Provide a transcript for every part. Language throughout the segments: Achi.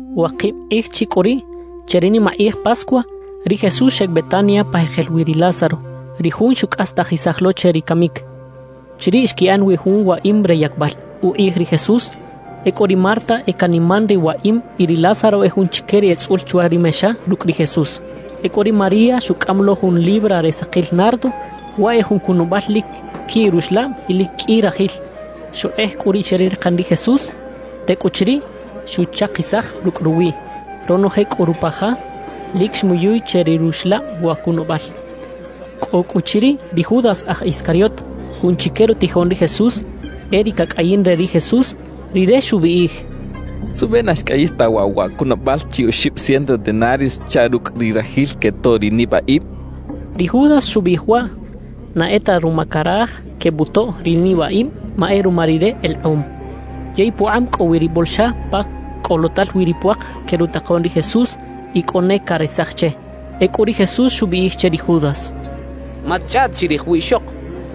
Wakib kꞌij chi cꞌu riꞌ che ri nimakꞌij Pascua, ri Jesús xeꞌec Betania pa jekel wi ri Lázaro, ri jun xucꞌastajisaj lo che ri camic. Chiriꞌ xquiꞌan wi jun waꞌim re yacbal ukꞌij ri Jesús. Ecꞌu ri Marta e caniman ri waꞌim y ri Lázaro e jun chique ri etzꞌul chwa ri mexa rucꞌ ri Jesús. Ecꞌu ri María xucꞌam lo jun libra re sakil nardo, waꞌ e jun cunabal lic quiꞌ ruxlab y lic qꞌui rajil. Xukꞌej cꞌu riꞌ che ri rakan ri Jesús; tecꞌuchiriꞌ, xuchakisaj rucꞌ ruwiꞌ. Ronoje cꞌu rupa ja lic xmuyuy che ri ruxlab wa cunabal. Cꞌo cꞌu chiriꞌ ri Judas aj Iscariot, jun chique rutijoꞌn ri Jesús. (E ri cacꞌayin re ri Jesús). Rire xubiꞌij: —¿Suꞌbe na xcꞌayix ta waꞌ wa cunabal chi oxib ciento denarios chaꞌ rucꞌ ri rajil quetoꞌ ri nibaꞌib? —xchaꞌ. Ri Judas xubiꞌij waꞌ na e ta ruma caraj quebutoꞌ ri nibaꞌib, ma e ruma rire elekꞌom. Yey pukꞌab cꞌo wi ri bolxa pa cꞌolotal wi ri puak que rutakoꞌn ri Jesús y cꞌo ne caresaj che. Ecꞌu ri Jesús xubiꞌij che ri Judas: —Matchꞌaꞌt chirij wiꞌxok,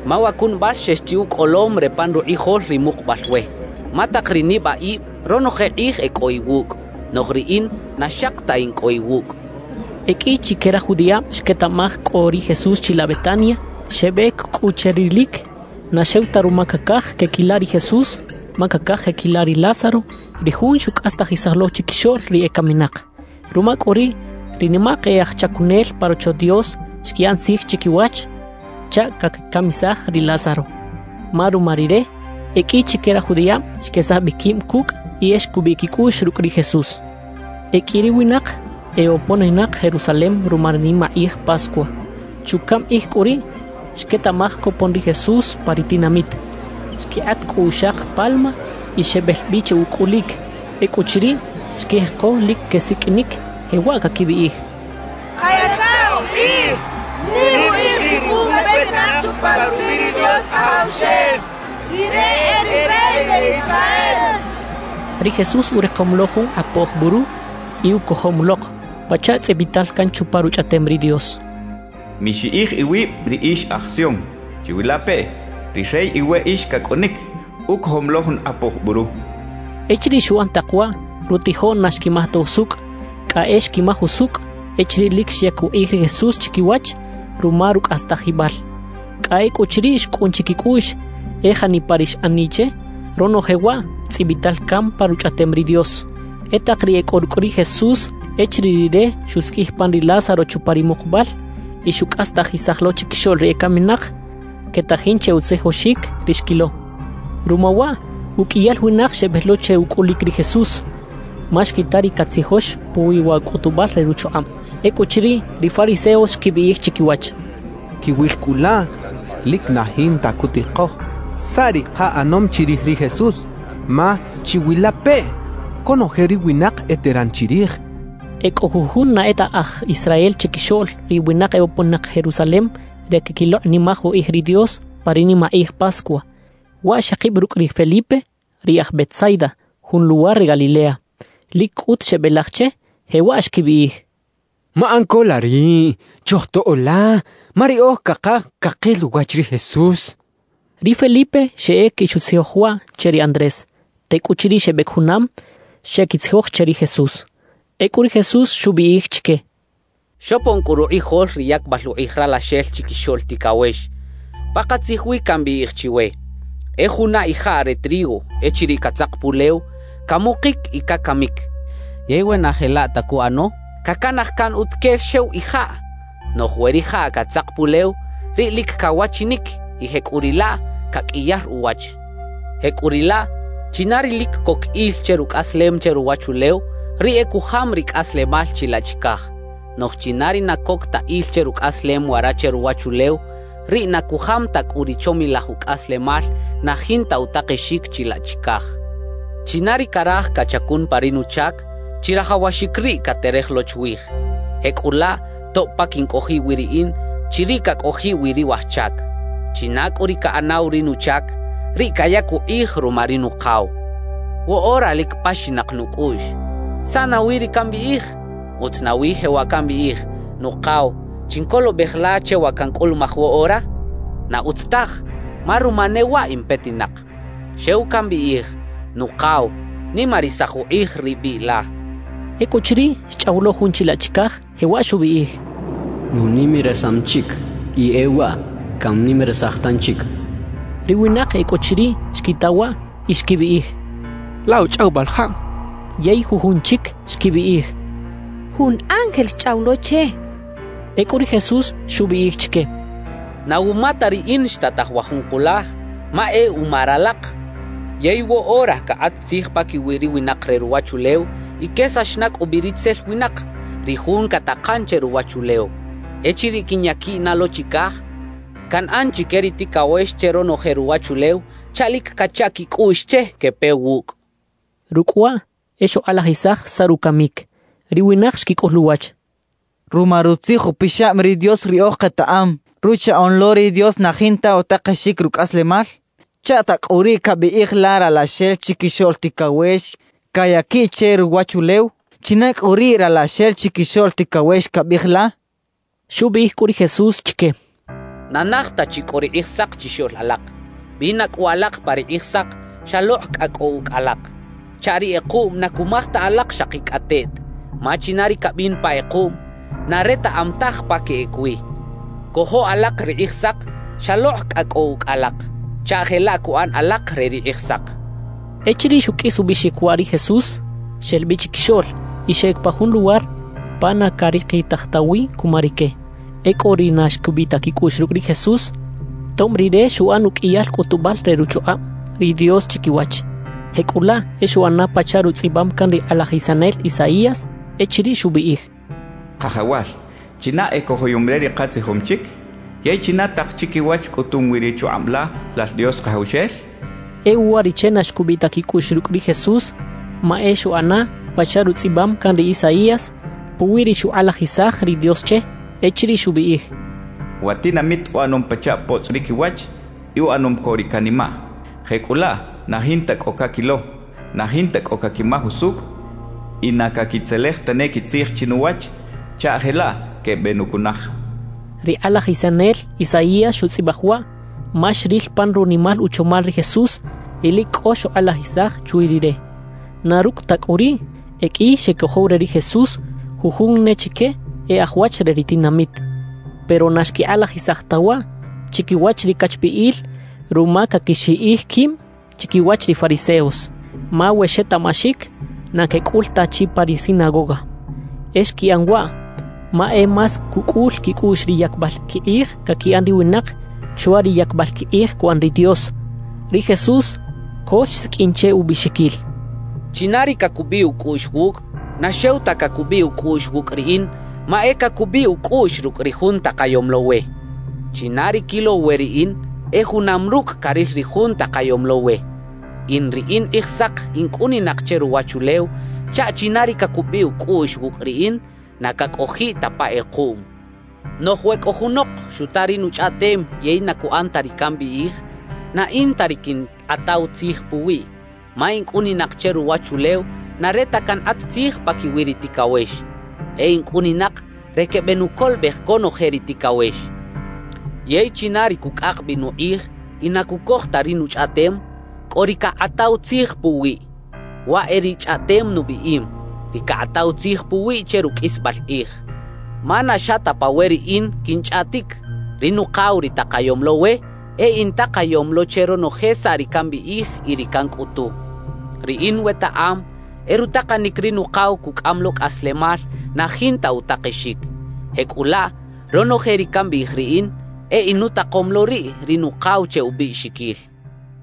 ma wa cunabal xex chi ucꞌolom re pan rukꞌijol ri mukubal we. Ma tak ri nibaꞌib ronoje kꞌij e cꞌo iwucꞌ, noꞌj riꞌin na xaki ta in cꞌo iwucꞌ —xchaꞌ. E qꞌui chique raj judiꞌab xquetaꞌmaj cꞌo ri Jesús chilaꞌ Betania. Xebec cꞌu che rilic, na xew ta ruma cacaj queꞌquila ri Jesús, ma cacaj queꞌquila ri Lázaro, ri jun xucꞌastajisaj lo chiquixoꞌl ri ecaminak. Ruma cꞌu riꞌ, ri nimak e aj chacunel pa Rocho Dios xquiꞌan tzij chiquiwach chaꞌ caquicamisaj ri Lázaro; ma ruma rire, e qꞌui chique raj judiꞌab xquesaj bi quib cucꞌ y e xcubiꞌ quicꞌuꞌx rucꞌ ri Jesús. E qꞌui ri winak eboponinak Jerusalem ruma ri nimakꞌij Pascua. Chucaꞌm kꞌij cꞌu riꞌ xquetaꞌmaj copon ri Jesús pa ri tinamit. Xquikꞌat cꞌu uxak palma y xebel bi che ucꞌulic. Ecꞌuchiriꞌ, xquijeko lic quesiqꞌuinic, jewaꞌ caquibiꞌij: «¡Kayaca ukꞌij! ¡Nim ukꞌij ri jun petinak chupa rubiꞌ ri Dios Kajawxel! ¡Rire e ri Rey re Israel!» quechaꞌ. Ri Jesús urikom lo jun kꞌapoj buru y ucojom lok, pachaꞌ tzꞌibital can chupa Ruchꞌaꞌtem ri Dios: Mixiꞌij iwib ri ix aj Sion. Chiwilapeꞌ, ri Rey iweꞌix cacꞌunic, ucojom lo jun kꞌapoj buru cachaꞌ. Echiriꞌ xuꞌan tak waꞌ, rutijoꞌn na xquimaj ta usucꞌ; cꞌa e xquimaj usucꞌ echiriꞌ lic xyac ukꞌij ri Jesús chiquiwach ruma rucꞌastajibal. Cꞌa ecꞌuchiriꞌ xcꞌun chiquicꞌuꞌx, e janipa ri xꞌaniꞌ che, ronoje waꞌ tzꞌibital can pa Ruchꞌaꞌtem ri Dios. E tak ri e cꞌo rucꞌ ri Jesús echiriꞌ Rire xusiqꞌuij pan ri Lázaro chupa ri mukubal y xucꞌastajisaj lo chiquixoꞌl ri ecaminak, quetajin che utzijoxic ri xquilo. Ruma waꞌ, uqꞌuiyal winak xebel lo che ucꞌulic ri Jesús, ma xquita ri catzijox puwi wa cꞌutubal re ruchukꞌab. Ecꞌuchiriꞌ, ri fariseos xquibiꞌij chiquiwach: «Quiwil cꞌu laꞌ, lic na jinta cutikoj saꞌ ri kaꞌanom chirij ri Jesús, ma ¡chiwilapeꞌ! conoje ri winak eteran chirij» xechaꞌ. E cꞌo jujun na e ta aj Israel chiquixoꞌl ri winak eboponinak Jerusalem re queꞌquilokꞌnimaj ukꞌij ri Dios pa ri nimakꞌij Pascua. Waꞌ xekib rucꞌ ri Felipe, ri aj Betsaida, jun luwar re Galilea. Lic cꞌut xebelaj che, jewaꞌ xquibiꞌij: —Maꞌan co la riꞌ, chojtoꞌo la, ma riꞌoj cakaj cakil uwach ri Jesús —xechaꞌ. Ri Felipe xeꞌec y xutzijoj waꞌ che ri Andrés. Tecꞌuchiriꞌ xebec junam, xeꞌquitzijoj che ri Jesús. Ecꞌu ri Jesús xubiꞌij chique: —Xopon cꞌu rukꞌijol ri yacbal ukꞌij Ralaxel Chiquixoꞌl Ticawex. Pakatzij wi cambiꞌij chiwe: E juna ijaꞌ re trigo echiriꞌ catzak pulew, camukic y cacamic. Yey we na jelaꞌ ta cuꞌano, cacanaj can utuquel xew ijaꞌ. Noꞌj we rijaꞌ catzak pulew, riꞌ lic cawachinic y jecꞌuriꞌlaꞌ caqꞌuiyar uwach. Jecꞌuriꞌlaꞌ, china ri lic coc il che rucꞌaslem che ruwachulew, riꞌ e cujam ri cꞌaslemal chilaꞌ chicaj; noꞌj china ri na coc ta il che rucꞌaslem wara che ruwachulew, riꞌ na cujam ta cꞌu ri chomilaj ucꞌaslemal na jinta utakexic chilaꞌ chicaj. »China ri caraj cachacun pa ri nuchac, chirajawaxic riꞌ caterej lo chwij. Jecꞌulaꞌ tob pa quincꞌojiꞌ wi riꞌin, chiriꞌ cacꞌojiꞌ wi ri waj chac. China cꞌu ri caꞌanaw ri nuchac, riꞌ cayac ukꞌij ruma ri Nukaw. »Woꞌora lic paxinak nucꞌuꞌx. ¿Saꞌ nawi ri cambiꞌij? ¿Utz nawi jewaꞌ cambiꞌij: “Nukaw, chincolobej la che wa cancꞌulumaj woꞌora”? ¡Na utz taj! Ma ruma ne waꞌ in petinak. Xew cambiꞌij: “Nukaw, nimarisaj ukꞌij ri biꞌ la” —xchaꞌ. Ecꞌuchiriꞌ, xchꞌaw lo Jun chilaꞌ chicaj, jewaꞌ xubiꞌij: —Nunimarisam chic, y e waꞌ cannimarisaj tanchic —xchaꞌ. Ri winak e cꞌo chiriꞌ xquita waꞌ y xquibiꞌij: «Laꞌ uchꞌawibal jab.» Yey jujun chic xquibiꞌij: «Jun ángel xchꞌaw lo che» xechaꞌ. Ecꞌu ri Jesús xubiꞌij chique: —Na wuma ta riꞌin xtataj wa jun kulaj, ma e uma ralak. Yey woꞌora cakꞌat tzij paquiwi ri winak re ruwachulew y quesax na cꞌu bi ritzel winak, ri jun catakan che ruwachulew. Echiriꞌ quinyaquiꞌ na lo chicaj, canꞌan chique ri ticawex che ronoje ruwachulew chaꞌ lic cacha quicꞌuꞌx che quepe wucꞌ —xchaꞌ. Rucꞌ waꞌ e xukꞌalajisaj saꞌ rucamic. Ri winak xquicꞌul uwach: —Ruma Rutzij Upixab ri Dios riꞌoj ketaꞌam: Ruchaꞌoꞌn lo ri Dios na jinta utakexic rucꞌaslemal. ¿Chaꞌta cꞌu riꞌ cabiꞌij la Ralaxel Chiquixoꞌl Ticawex cayaquiꞌ che ruwachulew? ¿China cꞌu riꞌ “Ralaxel Chiquixoꞌl Ticawex” cabiꞌij la? —xechaꞌ. Xubiꞌij cꞌu ri Jesús chique: —Na naj ta chi cꞌo ri Kꞌijsak chixoꞌl alak. Bina cꞌu alak pa ri Kꞌijsak xalokꞌ cꞌa cꞌo ucꞌ alak, chaꞌ ri kꞌekuꞌm na cumaj ta alak xakicꞌateꞌt. Ma china ri cabin pa kꞌekuꞌm, na retaꞌam taj pa queꞌec wi. Cojo alak ri Kꞌijsak xalokꞌ cꞌa cꞌo ucꞌ alak, chaꞌ jelaꞌ cuꞌan alak re ri Kꞌijsak —xchaꞌ. Echiriꞌ xuqꞌuis ubiꞌxic waꞌ ri Jesús, xel bi chiquixoꞌl y xeꞌec pa jun luwar pa na carikitaj ta wi cuma rique. E cꞌo ri na xcubiꞌ ta quicꞌuꞌx rucꞌ ri Jesús, tob Rire xuꞌan uqꞌuiyal cꞌutubal re ruchukꞌab ri Dios chiquiwach. Jecꞌulaꞌ e xuꞌana pachaꞌ rutzꞌibam can ri kꞌalajisanel Isaías echiriꞌ xubiꞌij: Kajawal, ¿china ecojoyom re ri katzijom chic? yey ¿China tak chiquiwach cꞌutum wi ri chukꞌab la, Lal Dios Kajawxel? xchaꞌ. E uwariꞌche na xcubiꞌ ta quicꞌuꞌx rucꞌ ri Jesús ma e xuꞌana pachaꞌ rutzꞌibam can ri Isaías puwi ri xukꞌalajisaj ri Dios che, echiriꞌ xubiꞌij: Wa tinamit uꞌanom pachaꞌ potzꞌ ri quiwach y uꞌanom co ri canimaꞌ; jecꞌulaꞌ na jinta cꞌo caquilo, na jinta cꞌo caquimaj usucꞌ y na caquitzelej tane quitzij chinuwach chaꞌ jelaꞌ quebenucunaj Ri kꞌalajisanel Isaías xutzꞌibaj waꞌ ma xril pan runimal uchomal ri Jesús y lic cꞌo xukꞌalajisaj chwi Rire. Na rucꞌ ta cꞌu riꞌ, e qꞌui xecojow re ri Jesús, jujun ne chique e aj wach re ri tinamit. Pero na xquikꞌalajisaj ta waꞌ chiquiwach ri cachbiꞌil ruma caquixiꞌij quib chiquiwach ri fariseos. Ma we xetaꞌmaxic, na quecꞌul ta chi pa ri sinagoga. E xquiꞌan waꞌ ma e más cucꞌul quicꞌuꞌx ri yacbal quikꞌij caquiꞌan ri winak, chwa ri yacbal quikꞌij cuꞌan ri Dios. Ri Jesús co xsiqꞌuin che ubiꞌxiquil: «China ri cacubiꞌ ucꞌuꞌx wucꞌ, na xew ta cacubiꞌ ucꞌuꞌx wucꞌ riꞌin, ma e cacubiꞌ ucꞌuꞌx rucꞌ ri Jun takayom lo we. China ri quilow we riꞌin, e junam rucꞌ caril ri Jun takayom lo we. »In ri in Kꞌijsak in cꞌuninak che ruwachulew chaꞌ china ri cacubiꞌ ucꞌuꞌx wucꞌ riꞌin, na cacꞌojiꞌ ta pa kꞌekuꞌm. Noꞌj we cꞌo junok xuta ri nuchꞌaꞌtem yey na cuꞌan ta ri cambiꞌij, na in ta ri quinkꞌataw tzij puwiꞌ. Ma in cꞌuninak che ruwachulew na re ta cankꞌat tzij paquiwi ri ticawex; e in cꞌuninak re quebenucolobej conoje ri ticawex. »Yey china ri cucꞌak bi nukꞌij y na cucoj ta ri nuchꞌaꞌtem, cꞌo ri cakꞌataw tzij puwiꞌ. Waꞌ e ri chꞌaꞌtem nubiꞌim, ri cakꞌataw tzij puwiꞌ che ruqꞌuisbal kꞌij. Ma na xa ta pa we riꞌin quinchꞌaꞌtic; ri Nukaw ri takayom lo we, e intakayom lo che ronoje saꞌ ri cambiꞌij y ri cancꞌutu. Riꞌin wetaꞌam e rutakanic ri Nukaw cucꞌam lo cꞌaslemal na jinta utakexic. Jecꞌulaꞌ, ronoje ri cambiꞌij riꞌin, e inutakom lo riꞌ ri Nukaw che ubiꞌxiquil» xchaꞌ.